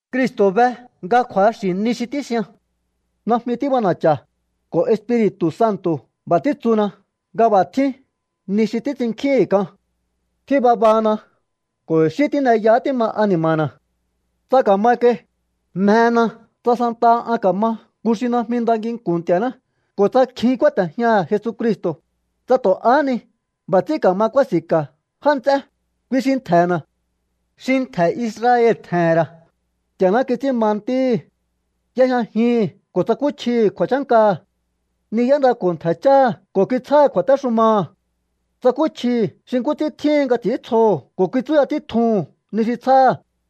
Cristo̱ be nga kju̱axi̱ ni xi tíxian. Najmi tíb'ana̱cha̱. Ko̱ Espiri̱tu̱ Santo̱ b'a̱ títsuna nga b'a̱ tjín ni xi títs'inkjíhi̱n k'an. Tjín babana ko̱ i̱xí tíneyahá tíma ani̱ma̱na̱. Tsa ka̱ma kai, mjena tsa santaha an ka̱ma nku xi najmi nda nginku̱n Nti̱a̱ná ko̱ tsa kjin kúáte̱jñaha̱ Jesucristo̱, tsa tu̱ ahá ni b'a̱ ts'ín ka̱ma kúási̱nka̱ já nts'é, kui xi ntje̱na̱. Xi ntje̱ Israel tje̱he̱n ra̱. Nti̱a̱ná kits'ín ma ntíhi̱. Y'ejñajihi̱n ko̱ tsakúchjihi̱ kju̱a̱chánkaha̱. Ni y'éndako̱ ntje̱ cháha̱ ko̱ kitsjáha̱ kju̱a̱téxumaha̱. Tsakúchjihi̱ xi nkú ts'ín tjíhin nga ts'i̱íntsjoho̱ ko̱ kitsúya títjuhu̱n ni xi tsjáha̱.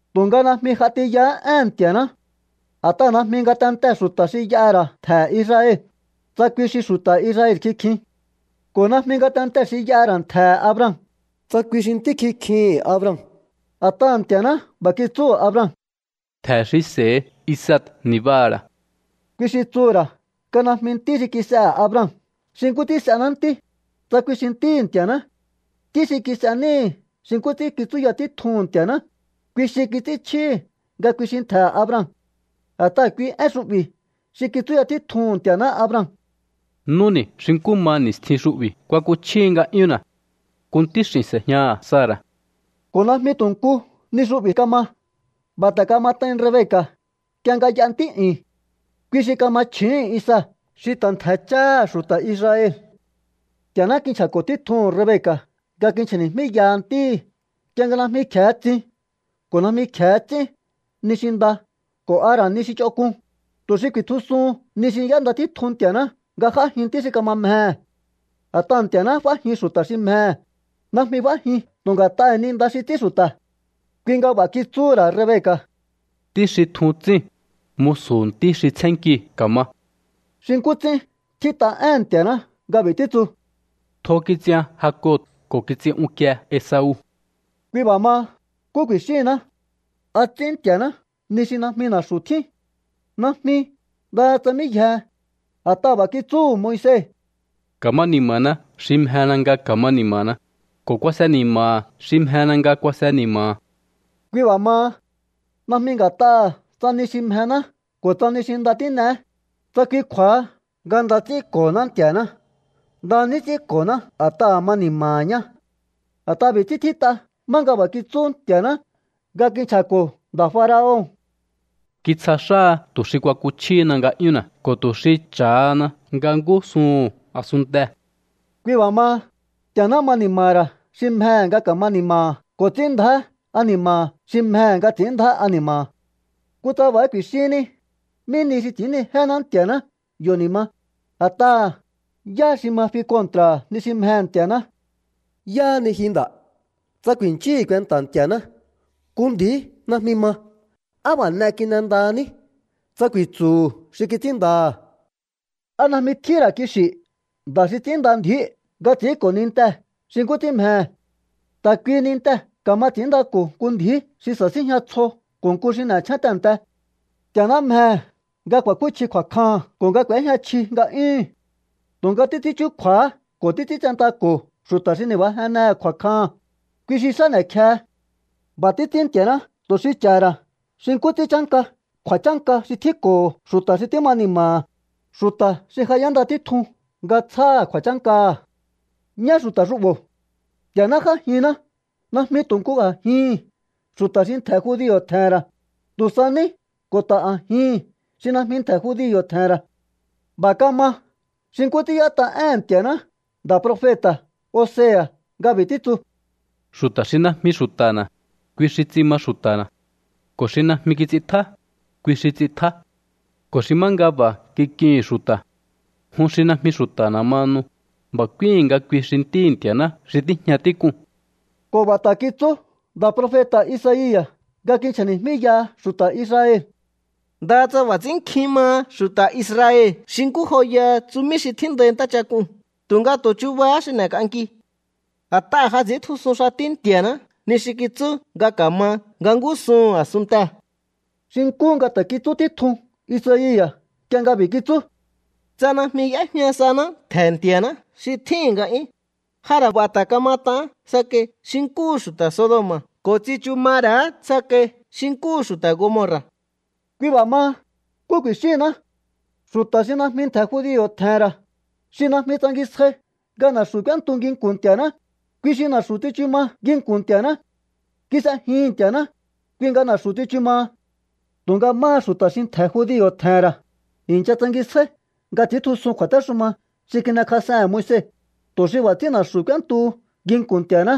Tu̱nga najmi j'a tiyahá éhe̱n Nti̱a̱ná. A̱t'aha̱ najmi ngatentee̱ xu̱ta̱ xi y'aha̱ ra̱ ntje̱he̱ Israel, tsa kui xi xu̱ta̱ Israel kikjin. Ko̱ najmi ngatentee̱ xi y'aha̱ ra̱ ntje̱he̱ Abraham, tsa kui xi ntí kikjihi̱n Abraham. A̱t'aha̱ Nti̱a̱ná b'a̱ kitsúhu̱ Abraham: “Ntje̱ xi s'e̱hi Isaac ni̱baha̱ ra̱.” Kui xi tsuhu̱ ra̱ nga najmi ntí xi kis'ehe̱ Abraham xi nkú ts'ín s'ená ntí, tsa kui xi ntíhi̱ Nti̱a̱ná. Ntí xi kis'e níhi̱ xi nkú ts'ín kitsúya títjun Nti̱a̱ná, kui xi kits'ínchjíhi̱ nga kui xi ntje̱he̱ Abraham. A̱t'aha̱ kui én xu'bi̱ xi kitsúya títjuhu̱n Nti̱a̱ná Abraham: “Núni̱ xi nkú ma ni̱stjin xu'bi̱ kuakuchjíhi nga'yúnna̱. Nku ntíx'i̱n s'e̱jñaha̱ Sara̱.” Ko̱ najmi tu̱ nku ni xu'bi̱ kama. B'a̱ ta̱ kamat'ain Rebeca̱ nk'ie nga y'a ntí'yu̱n. Kui xi kama chju̱úhu̱n Isaac xi ta̱ ntje̱ cháha̱ xu̱ta̱ Israel. Nti̱a̱ná kinchja̱ko̱ títjuhu̱n Rebeca̱ nga kinchja̱ni̱jmíyaha ntíhi̱ nk'ie nga najmi kje̱e tsin ko̱ najmi kje̱e ts'ín ni xi nda ko̱ a ra̱ ni xi ch'onk'un, tu̱ xi ku̱i̱tjusuhun ni xi y'énda títjun Nti̱a̱ná nga j'ájin ntí xi kama mjehe̱. A̱t'aha̱ Nti̱a̱ná f'ájin xu̱ta̱ xi mjehe̱, najmi f'ájin tu̱ nga̱t'aha̱ ni nda xi ts'ín xu̱ta̱. Kui nga b'a̱ kitsúhu̱ ra̱ Rebeca̱: “Ntí xi tjun tsíu̱n, musu̱hu̱ ntí xi tsjénkiu̱ ka̱ma.” Xi nkú ts'ín tjít'a éhe̱n Nti̱a̱ná nga b'i̱ títsu: “Tjo kits'ian Jacob ko̱ kits'in unkie Esau.” Kui b'a̱ maha, ¿nkú ku̱i̱xíhinná? ¿A ts'ín Nti̱a̱ná ni xi najmi na̱xu̱ tjín? ¡Najmi! ¡Ndaha tsa mí yjehe! A̱t'aha̱ b'a̱ kitsúhu̱ Moise: “Ka̱ma ni̱ma̱na xi mjena nga ka̱ma ni̱ma̱na, ko̱ kuase ni̱ma̱ha̱ xi mjena nga kuase ni̱ma̱ha̱.” Kui b'a̱ maha, najmi nga̱t'aha̱ tsa ni xi mjená ko̱ tsa ni nda xi tín'eé, tsa kui kju̱a̱ha nga nda ts'ínko̱honá Nti̱a̱ná. Nda ní ts'ínko̱ná a̱t'aha̱ ma ni̱ma̱ha̱ ñá. A̱t'aha̱ b'i̱ ts'ín tjít'a má nga b'a̱ kitsú Nti̱a̱ná nga kinchja̱ko̱ nda̱ faraon: “Kitsja xáha tu̱ xi kuakuchjíhina nga'yúnna̱ ko̱ tu̱ xi cha̱hana nga ngúsuhu̱n a̱sunntee̱.” Kui b'a̱ maha, Nti̱a̱ná ma ni̱ma̱ha̱ ra̱ xi mjehe̱ nga ka̱ma ni̱ma̱ha̱ ko̱ ts'ín ndjá ani̱ma̱ha̱ xi mjehe̱ nga ts'i̱ín ndjá ani̱ma̱ha̱. Kutsa b'a̱há ku̱i̱xínní: “¿Mí nihi xi ts'i̱ínnijéhená Nti̱a̱ná yo̱ ni̱ ma? A̱t'aha̱, ¿yá xi ma fi kontra̱ha̱ ni xi mjehe̱ Nti̱a̱ná?” ¿Yáhá ni ji nda̱, tsa ku̱i̱nchíhi̱ kuenta̱ Nti̱a̱ná? Nku ndji̱í najmi ma: “¿Á b'a̱ n'e kin'endahaní?”, tsa ku̱i̱tsu̱hu̱ xi kits'ínndaha̱. ¿A najmi tjíhín ra̱ kixi̱ nda̱ xi ts'ínnda ndi̱íu̱ nga ts'i̱ínko̱ nintee̱ xi nkú ts'ín mjehe̱? Ta̱ kuihi nintee̱ ka̱ma ts'i̱ínndako̱ nku ndji̱í xi sasíjña tsjo ko̱ nku xi n'echjén tehe̱nte. Nti̱a̱ná mjehe̱ nga ku̱a̱kúchji kju̱a̱kjaha̱n ko̱ nga k'u̱éjña chji nga'yúhu̱n. Tu̱nga títs'ín chúkju̱a̱ha ko̱ títs'íntsentako̱ xu̱ta̱ xi ni̱bajennehe̱ kju̱a̱kjaha̱n, kui xi xá n'e̱kjehe. B'a̱ títs'ín Nti̱a̱ná tu̱ xi cha̱ha̱ ra̱ xi nkú ts'ín chánka kju̱a̱chánka xi tjínko̱ho̱ xu̱ta̱ xi tíma ni̱ma̱ha̱, xu̱ta̱ xi ja y'énda títjun nga tsjáha̱ kju̱a̱chánkaha̱. Ñá xu̱ta̱ xu'bo̱. Nti̱a̱ná j'ájinná najmi tu̱ nku a̱jihi̱n xu̱ta̱ xi ntje̱ judio̱ tje̱he̱n ra̱, tu̱ sa ní ko̱ ta̱ a̱jihi̱n xi najmi ntje̱ judio̱ tje̱he̱n ra̱. B'a̱ kama xi nkú ts'ín y'ét'a éhe̱n Nti̱a̱ná nda̱ profeta̱ Osea̱ nga b'i̱ títsu: Xu̱ta̱ xi najmi xu̱ta̱na̱, kui xi ts'in ma xu̱ta̱na̱. Ko̱ xi najmi kits'intjá, kui xi ts'intjá. Ko̱ xi má nga b'a̱ kik'ihi̱n xu̱ta̱: “Jun xi najmi xu̱ta̱na̱ mahanu”, b'a̱ k'úíi̱n nga kui xi ntíhi̱ Nti̱a̱ná xi tíjña tík'uu̱n. Ko̱ b'a̱ ta̱ kitsú nda̱ profeta̱ Isaia̱ nga kinchja̱ni̱jmíyaha xu̱ta̱ Israel: “Ndaha tsa b'a̱ ts'ín nkjin maha xu̱ta̱ Israel xi nkú joyaha tsumí xi tjíndai ntáchak'uu̱n, tu̱nga tu̱ chubahá xi n'e̱k'anki. A̱t'aha̱ ja ts'i̱íntjusun xatí Nti̱a̱ná ni xi kitsú nga ka̱ma nga ngúsuhu̱n a̱sunntee̱.” Xi nkú nga ta̱ kitsú títjun Isaia̱ nk'ie nga b'i̱ kitsú: Tsa najmi y'éjña saná ntje̱ Nti̱a̱ná xi tjíhi̱n nga'yún, ja ra̱ b'a̱ ta̱ kamat'aán tsakai xi nkúhu xu̱ta̱ Sodoma̱ ko̱ tsichu ma ra̱á tsakai xi nkúhu xu̱ta̱ Gomorra̱. Kui b'a̱ maha, ¿nkú ku̱i̱xíhinná? Xu̱ta̱ xi najmi ntje̱ judio̱ tje̱he̱n ra̱, xi najmi tsangisjai nga na̱xu̱ k'úéntu nginku̱n Nti̱a̱ná, kui xi na̱xu̱ tsichu ma nginku̱n Nti̱a̱ná. Kis'ejihi̱n Nti̱a̱ná, kui nga na̱xu̱ tsichu maha. Tu̱nga máha xu̱ta̱ xi ntje̱ judio̱ tje̱he̱n ra̱, i̱ncha tsangisjáí nga ts'i̱íntjusun kju̱a̱téxuma xi kin'ekjas'ehe̱n Moise, tu̱ xi b'a̱ ts'ín na̱xu̱ k'úéntuhu nginku̱n Nti̱a̱ná,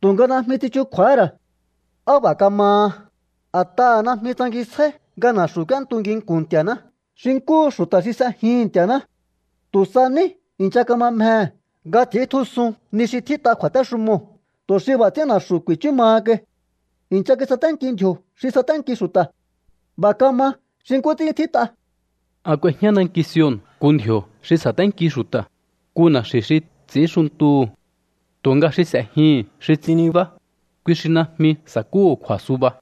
tu̱nga najmi tsichukju̱a̱há ra̱. ¿Á b'a̱ kamaha? A̱t'aha̱ najmi tsangisjáí nga na̱xu̱ k'úéntu nginku̱n Nti̱a̱ná xi nkúhu xu̱ta̱ xi s'ejihi̱n Nti̱a̱ná. Tu̱ sa ní i̱ncha kama mjehe̱ nga ts'i̱íntjusun ni xi tjít'a kju̱a̱téxumoo̱ tu̱ xi b'a̱ ts'ín na̱xu̱ ku̱i̱chú maha kai. I̱ncha kisaténki ndji̱o̱ xi saténki xu̱ta̱. B'a̱ kama xi nkú ts'ín tjít'a: An k'uejñá nanki Sion nku ndji̱o̱ xi sa̱ténki xu̱ta̱, nku na̱xi̱ xi ts'i̱ínxuntuhu̱. Tu̱nga xi s'e̱jihi̱n xi ts'in nibá, kui xi najmi sa̱kúhu̱ kju̱a̱suba.